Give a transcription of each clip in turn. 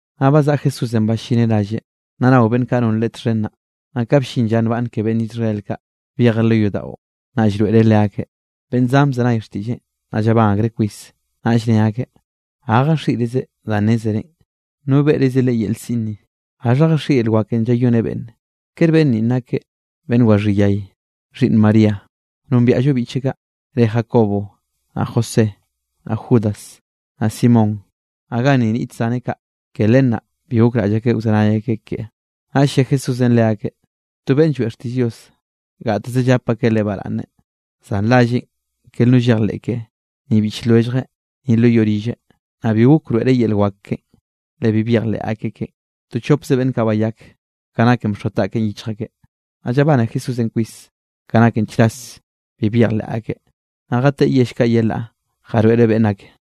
Naꞌ bazaꞌa Jesúsenꞌ ballineꞌ ralleꞌ, naꞌ nao beꞌnn kaꞌ non Leꞌe txhen naꞌ. Naꞌ ka bllin lla nbaꞌnne ke beꞌnn Israel kaꞌ, byejeꞌ lo yodaꞌon naꞌ llroeꞌreꞌ leakeꞌ. Beꞌnn zan bzenay xtiꞌlleꞌn, naꞌ llabán akreꞌ kwis, naꞌll ne akeꞌ: —¿Ga jaxiꞌrizeꞌ danꞌ nnezreꞌn? ¿No beꞌrize leꞌe yel siꞌn ni? ¿Gaxha jaxieꞌ yel wakenꞌ llayoneꞌ beꞌnne? ¿Kere beꞌnn ninꞌ nakeꞌ beꞌnn waxhí yay, xhiꞌnn María? Nombiaꞌllo biꞌcheꞌ kaꞌ, re Jacobo, naꞌ José, naꞌ Judas, naꞌ Simón, naꞌ ganni niꞌt zaneꞌ kaꞌ. Ke len naꞌ bi gokraꞌll akeꞌ wzenay akeꞌ keꞌe. Naꞌll lle Jesúsenꞌ le akeꞌ: —To beꞌnn lloeꞌ xtiꞌll Dios, gateze llap akeꞌ leꞌe baraꞌnne, zan ralleꞌ ker no llejleꞌ keꞌe, ni biꞌch lwelljeꞌ, ni lo yoꞌ rilleꞌ. Naꞌ bi gok wroeꞌreꞌ yel wak keꞌen, le bi byejleꞌ akeꞌ keꞌen. To chopze beꞌnn kaꞌ bayak, ka naken bxoa taꞌkeꞌn yichj akeꞌ. Naꞌ llabane Jesúsenꞌ kwis ka naken chras bi byejleꞌ akeꞌ. Naꞌ jateꞌe yell kaꞌ yelaꞌ jaroeꞌreꞌ beꞌnn ake.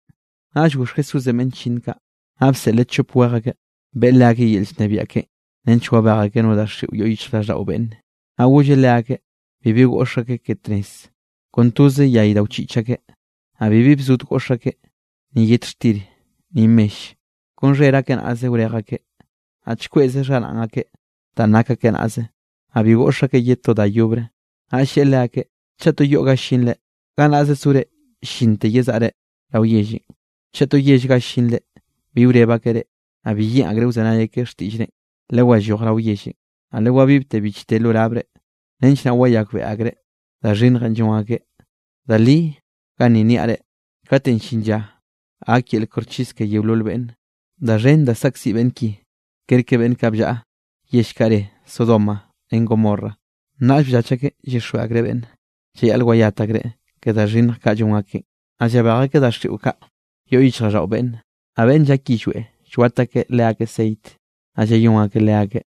Naꞌll goxh Jesúsenꞌ beꞌnn chllinn kaꞌ, naꞌ bseꞌleꞌ chop wej akeꞌ, beꞌe leakeꞌ yel llnebiaꞌ keꞌen nench wabej akeꞌ no daxiꞌo yoꞌ yichjraꞌlldaꞌo beꞌnne. Naꞌ golleꞌ leakeꞌ bibi goꞌx akeꞌ ke tnez, kon toze yay da wchiꞌch akeꞌ, naꞌ bibi bzod goꞌx akeꞌ, ni yet xtir, ni mell. Kon xher akeꞌ naꞌze wrej akeꞌ, naꞌ chkweꞌze xharaꞌn akeꞌ danꞌ nak akeꞌ naꞌze, naꞌ bi goꞌx akeꞌ ye to da yobre. Naꞌll lleꞌe leakeꞌ: —Chaꞌ to yoꞌ ga llinre, gannaꞌze sore llinte yezaꞌre rao yellenꞌ. Chaꞌ to yell ga llinre bi wreb akeꞌ reꞌ, naꞌ bi yeꞌn akre wzenay akeꞌ xtiꞌllrenꞌ, lewalloj rao yellenꞌ, naꞌ le wabibte bichte lo labre, nench naꞌ wayakbeꞌe akreꞌ da xhinnjenꞌ llon akeꞌ. Da li ganni niaꞌ reꞌ, katenꞌ llin lla gak yel koxchis ke yeolol beꞌnne, da xhen da saꞌkziꞌ beꞌnn ki kerke beꞌnn kaꞌ bllaꞌa yell kaꞌ re Sodoma ren Gomorra. Naꞌll bllach akeꞌ llyixjweꞌ akreꞌ beꞌnne, llayaꞌl wayat akreꞌ ke da xhinnj kaꞌ llon akeꞌn. Naꞌ llabej akeꞌ daxiꞌo kaꞌ yoꞌ yichjraꞌlldaꞌo beꞌnne, naꞌ beꞌnn llak yillweꞌ llwat akeꞌ leakeꞌ ceit, naꞌ llayón akeꞌ leakeꞌ.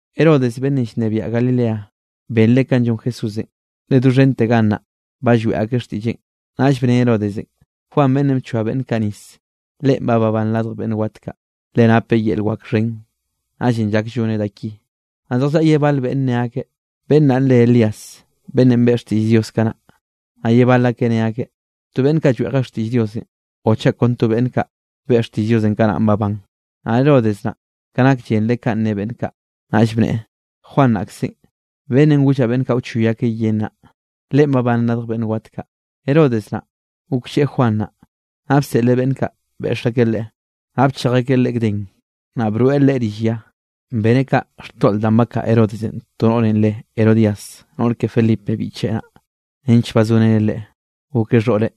Herodes beꞌnnenꞌ llnebiaꞌ Galileanꞌ, benreꞌ kanꞌ llon Jesúsenꞌ, le doxhen gannaꞌ ba lloeꞌ akeꞌ xtiꞌlleꞌn. Naꞌll bne Herodesenꞌ: —Juan, beꞌnnenꞌ bchoa beꞌnn kaꞌ nis, leꞌen ba babán radj beꞌnn wat kaꞌ, leꞌe napeꞌ yel wak xhen, naꞌllenꞌ llak lloneꞌ da ki. Naꞌ zjallaꞌa ye bal beꞌnn ne akeꞌ: —Beꞌnn naꞌn re Elías, beꞌnn beꞌe xtiꞌll Diosenꞌ kanaꞌn. Naꞌ ye bal akeꞌ ne akeꞌ: —To beꞌnn kaꞌ lloeꞌje xtiꞌll Diosenꞌ, o chaꞌ kon to beꞌnn kaꞌ beꞌe xtiꞌll Diosenꞌ kanaꞌ babán. Naꞌ Herodes naꞌ, ka nak llenreꞌ kanꞌ ne beꞌnn kaꞌ, naꞌll bneꞌe: —Juan naꞌkzenꞌ, beꞌnnenꞌ gollaꞌ beꞌnn kaꞌ wchoy akeꞌ yen naꞌ, leꞌen babán radj beꞌnn wat kaꞌ. Herodes naꞌ, goklleꞌe Juan naꞌ, naꞌ bseꞌleꞌ beꞌnn kaꞌ beꞌx akeꞌ leꞌe, naꞌ bchej akeꞌ leꞌe gden, naꞌ broeꞌ leꞌe rill ya. Beneꞌ kaꞌ xtoꞌl danꞌ bakaꞌa Herodesenꞌ to noꞌrenꞌ re Herodías, noꞌr ke Felipe biꞌcheꞌ naꞌ, nench bazoreneꞌ leꞌe, gokeꞌ xhoꞌreꞌ.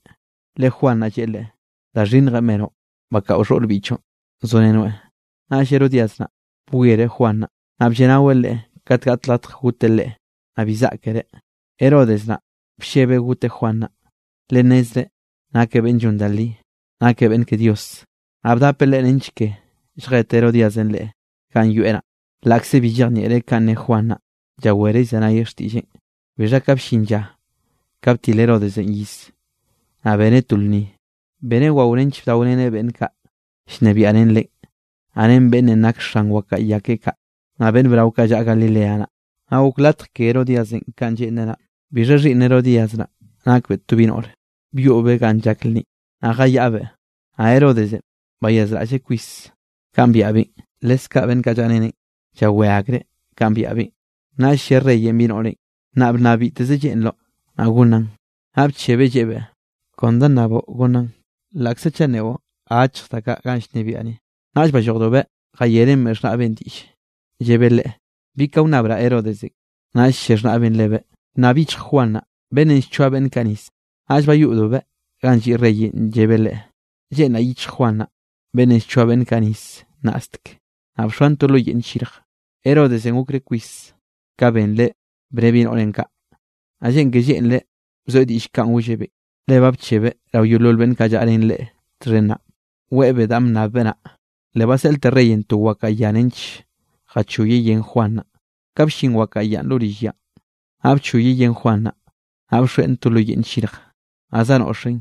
Le Juan naꞌ lleꞌe leꞌe: —Da xhinnjenꞌ benoꞌ bakaꞌo xhoꞌr biꞌchoꞌn zorenoeꞌ. Naꞌll Herodías naꞌ, bwiereꞌ Juan naꞌ, naꞌ blleꞌnaweꞌ leꞌe kat gaꞌt latj goteꞌ leꞌe, naꞌ bi zaꞌkereꞌ. Herodes naꞌ, bllebeꞌ goteꞌ Juan naꞌ, le nnezreꞌ nakeꞌ beꞌnn llon da li, nakeꞌ beꞌnn ke Dios, naꞌ bdapeꞌ leꞌe nench ke lljet Herodíasenꞌ leꞌe ganꞌ yoeꞌ naꞌ. Laꞌkze bi llejnieꞌreꞌ kanꞌ ne Juan naꞌ, llawereꞌ llzenayeꞌ xtiꞌlleꞌn. Bixha ka bllin lla ka btil Herodesenꞌ iz, naꞌ beneꞌ to lnni, beneꞌ wao nench bdaoreneꞌ beꞌnn kaꞌ llnebiaꞌ ren leꞌen, naꞌ ren beꞌnnenꞌ nak xan wakaꞌa ya keꞌe kaꞌ, naꞌ beꞌnn brao kaꞌ llaꞌa Galilea naꞌ; naꞌ gok latj ke Herodíasenꞌ kanꞌ lleꞌnreꞌ naꞌ. Bixha xhiꞌnn Herodías naꞌ, nakbeꞌ to bi noꞌre byoꞌbeꞌ ganꞌ llak lnninꞌ, naꞌ jayaꞌbeꞌ; naꞌ Herodesenꞌ bayazraꞌlleꞌ kwis kanꞌ byaꞌbeꞌn, leskaꞌ beꞌnn kaꞌ llaꞌreneꞌn, llawé akreꞌ kanꞌ byaꞌbeꞌn. Naꞌll lle reyenꞌ bi noꞌrenꞌ: —Naꞌ bnnab bitteze lleꞌnroꞌ, naꞌ gonnaꞌn. Naꞌ bchebeꞌ, lleꞌebeꞌ: —Kon da nnaboꞌ gonnaꞌn, laꞌkze chaꞌ nneꞌo achj da kaꞌ ganꞌ llnebiaꞌ ni. Naꞌll ballojdobeꞌ jayeꞌrenbeꞌ xhnaꞌbeꞌn diꞌlle llebe leꞌe: —¿Bi ka wnnabraꞌ Herodesenꞌ? Naꞌll lle xhnaꞌbeꞌn lebeꞌ: —Bnnab yichj Juan naꞌ, beꞌnnenꞌ llchoa beꞌnn kaꞌ nis. Naꞌll bayoꞌdobeꞌ ganꞌ lliꞌ reyenꞌ, llebeꞌ leꞌe: —Lleꞌnraꞌ yichj Juan naꞌ, beꞌnnenꞌ llchoa beꞌnn kaꞌ nis nnaꞌstek, naꞌ bxoan to lo yeꞌnne nllirj. Herodesenꞌ gokreꞌ kwis ka benreꞌ bne bi noꞌrenꞌ kaꞌ, naꞌ lleꞌn ke lleꞌnreꞌ bzoeꞌ diꞌll kanꞌ gollebeꞌ, le ba bchebeꞌ rao yeolol beꞌnn kaꞌ llaꞌa ren leꞌe txhen naꞌ, weꞌebeꞌ danꞌ bnnabbeꞌ naꞌ. Le baseꞌlte reyenꞌ to wakaꞌa ya nench jachoyeꞌ yen Juan naꞌ. Ka bllin wakaꞌa yanꞌ lo rill yanꞌ, naꞌ bchoyeꞌ yen Juan naꞌ, naꞌ baxoeꞌn to lo yeꞌnn nllirj, naꞌ zanoꞌxeꞌn,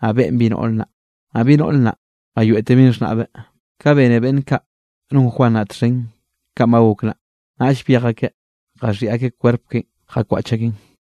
naꞌ beꞌen bi noꞌr naꞌ; naꞌ bi noꞌr naꞌ bayoeꞌtebeꞌn xhnaꞌbeꞌ. Ka bene beꞌnn kaꞌ non Juan naꞌ txhen kanꞌ ba gok naꞌ, naꞌll byej akeꞌ jaxhiꞌi akeꞌ kwerp keꞌen jakwaꞌch akeꞌn.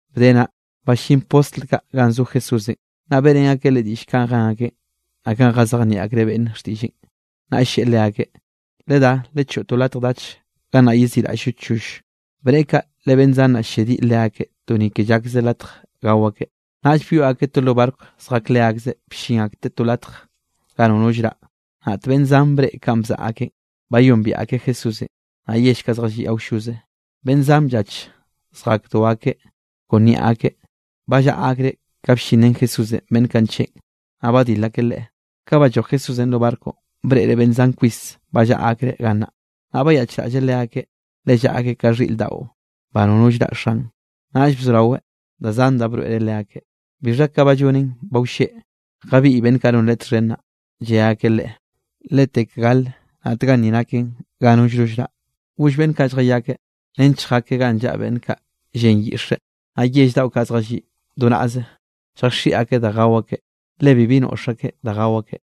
Bde naꞌ, ballín postl kaꞌ ganꞌ zo Jesúsenꞌ, naꞌ beꞌrén akeꞌ Leꞌe diꞌll kanꞌ jen akeꞌn, naꞌ kanꞌ jazejnieꞌ akreꞌ beꞌnne xtiꞌlleꞌn. Naꞌll lleꞌe leakeꞌ: —Ledá, lechoꞌo to latj dach gannaꞌ yeziꞌraꞌll-llo choll. Bneꞌe kaꞌ, le beꞌnn zan naꞌ, llediꞌ leakeꞌ to ni ke llakze latj gao akeꞌ. Naꞌll byoꞌ akeꞌ to lo barco zjak leakzeꞌ bllin akteꞌ to latj ga nono llraꞌ. Naꞌt beꞌnn zan breꞌe kanꞌ bzaꞌa akeꞌn, bayombiaꞌ akeꞌ Jesúsenꞌ. Naꞌ yell kaꞌ zjalliꞌ awlloze, beꞌnn zan bllach zjakdo akeꞌ kon niaꞌ akeꞌ, ba llaꞌa akreꞌ ka bllin ren Jesúsenꞌ beꞌnn kaꞌ ncheꞌn, naꞌ badil akeꞌ Leꞌe. Ka balloj Jesúsenꞌ lo barconꞌ, breꞌreꞌ beꞌnn zan kwis ba llaꞌa akreꞌ gannaꞌ, naꞌ bayaꞌchraꞌlleꞌ leakeꞌ, le llaꞌa akeꞌ ka llaꞌa xhiꞌr daꞌo ba nono llraꞌ xan, naꞌll bzoraweꞌ da zan broeꞌreꞌ leakeꞌ. Bixha ka ba llonen ba wlleꞌ, jabiꞌy beꞌnn kaꞌ non Leꞌe txhen naꞌ, lle akeꞌ Leꞌe: —Letek gale naꞌt ganni naken ga nollno llraꞌ. Goll beꞌnn kaꞌ lljayakeꞌ nench lljakeꞌ ganꞌ llaꞌa beꞌnn kaꞌ llen lyiꞌxe, naꞌ yell daꞌo kaꞌ zjalliꞌ do naꞌze, lljaxiꞌi akeꞌ da gao akeꞌ, le bibi noꞌx akeꞌ da gao akeꞌ.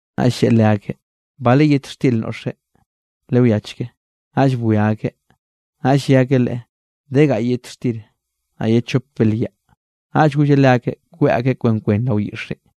Naꞌll lleꞌe leakeꞌ: —¿Bale yet xtir noꞌxre? Lewiachke. Naꞌll bwia akeꞌ, naꞌll lle akeꞌ Leꞌe: —De gaꞌy yet xtir, naꞌ ye chop belyaꞌ. Naꞌll golleꞌ leakeꞌ kweꞌ akeꞌ kwen kwen rao yiꞌxenꞌ.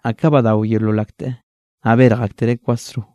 Naꞌ ka badao yeolol akteꞌ, naꞌ berj aktereꞌ kwasro.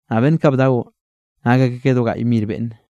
Naꞌ beꞌnn kaꞌ bdaonꞌ nak akeꞌ ka do gaꞌy mir beꞌnne.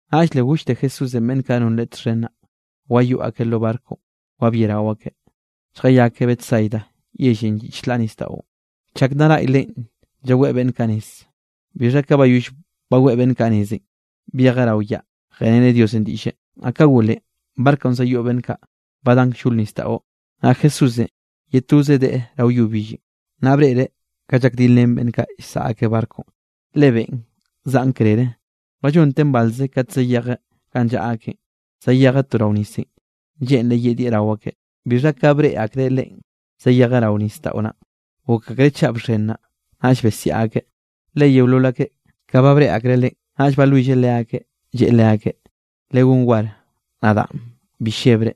Naꞌll le gollte Jesúsenꞌ beꞌnn kaꞌ non Leꞌe txhen naꞌ, wayoꞌ akeꞌ lo barconꞌ wabiarao akeꞌ, lljayakeꞌ Betsaida yellenꞌ lliꞌ chlaꞌ nisdaꞌon, chak nna naꞌy Leꞌen llaweꞌ beꞌnn kaꞌ nez. Bixha ka bayoll baweꞌ beꞌnn kaꞌ nezenꞌ, byejeꞌ rao yaꞌ jeꞌreneꞌ Diosenꞌ diꞌlle. Naꞌ ka golen, barconꞌ zayoꞌ beꞌnn kaꞌ, ba dan kllol nisdaꞌon, naꞌ Jesúsenꞌ ye toze deꞌe rao yo billenꞌ. Naꞌ breꞌreꞌ ka llakdil ren beꞌnn kaꞌ llsaꞌa akeꞌ barconꞌ, le beꞌn zaꞌn krere; ba llonten balze kate zayejeꞌ ganꞌ llaꞌa akeꞌn, zayejeꞌ to rao nisenꞌ, lleꞌnreꞌ yedieꞌ rao akeꞌ. Bixha ka breꞌe akreꞌ Leꞌen zayejeꞌ rao nisdaꞌo naꞌn, gok akreꞌ chaꞌ bxen naꞌ, naꞌll besiaꞌ akeꞌ. Le yeolol akeꞌ, ka ba breꞌe akreꞌ Leꞌen blleb akeꞌ. Naꞌll balwilleꞌ leakeꞌ lleꞌe leakeꞌ: —¡Legón war, nadaꞌn, bi llebre!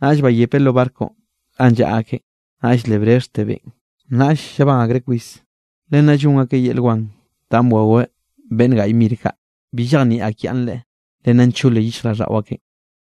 Naꞌll bayepeꞌ lo barconꞌ ganꞌ llaꞌa akeꞌn, naꞌll le brexhte beꞌn, naꞌll llabán akreꞌ kwis. Le nna llon akeꞌ yel wan danꞌ bwaweꞌ beꞌnn gaꞌy mir kaꞌ, bi llejnieꞌ akyaꞌnnreꞌ, le nna nchole yichjraꞌlldaꞌo akeꞌn.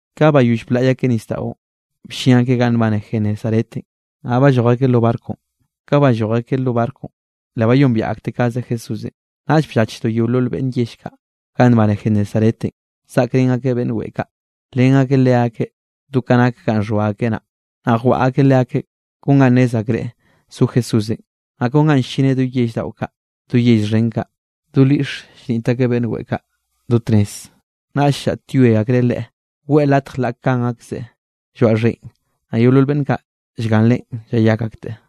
Ka bayoll blaꞌy akeꞌ nisdaꞌon, bllin akeꞌ ganꞌ nbane Genesaretenꞌ, naꞌ balloj akeꞌ lo barconꞌ. Ka balloj akeꞌ lo barconꞌ, le bayombiaꞌ akteꞌ kaze Jesúsenꞌ. Naꞌll bllachdo yeolol beꞌnn yell kaꞌ ganꞌ nbane Genesaretenꞌ, zaꞌkrén akeꞌ beꞌnn weꞌe kaꞌ, nlen akeꞌ leakeꞌ do ka nak ganꞌ xhoa akeꞌ naꞌ. Naꞌ jwaꞌa akeꞌ leakeꞌ kon ga nnez akreꞌ zo Jesúsenꞌ. Naꞌ kon ganꞌ ll-llineꞌ do yell daꞌo kaꞌ, do yell xhen kaꞌ, do lyiꞌxe llniꞌt akeꞌ beꞌnn weꞌe kaꞌ do tnez; naꞌll llaꞌtyoe akreꞌ Leꞌe, weꞌe latj laꞌ kan akzeꞌ lloaꞌ xheꞌe, naꞌ yeolol beꞌnn kaꞌ llgan Leꞌen llayak akteꞌ.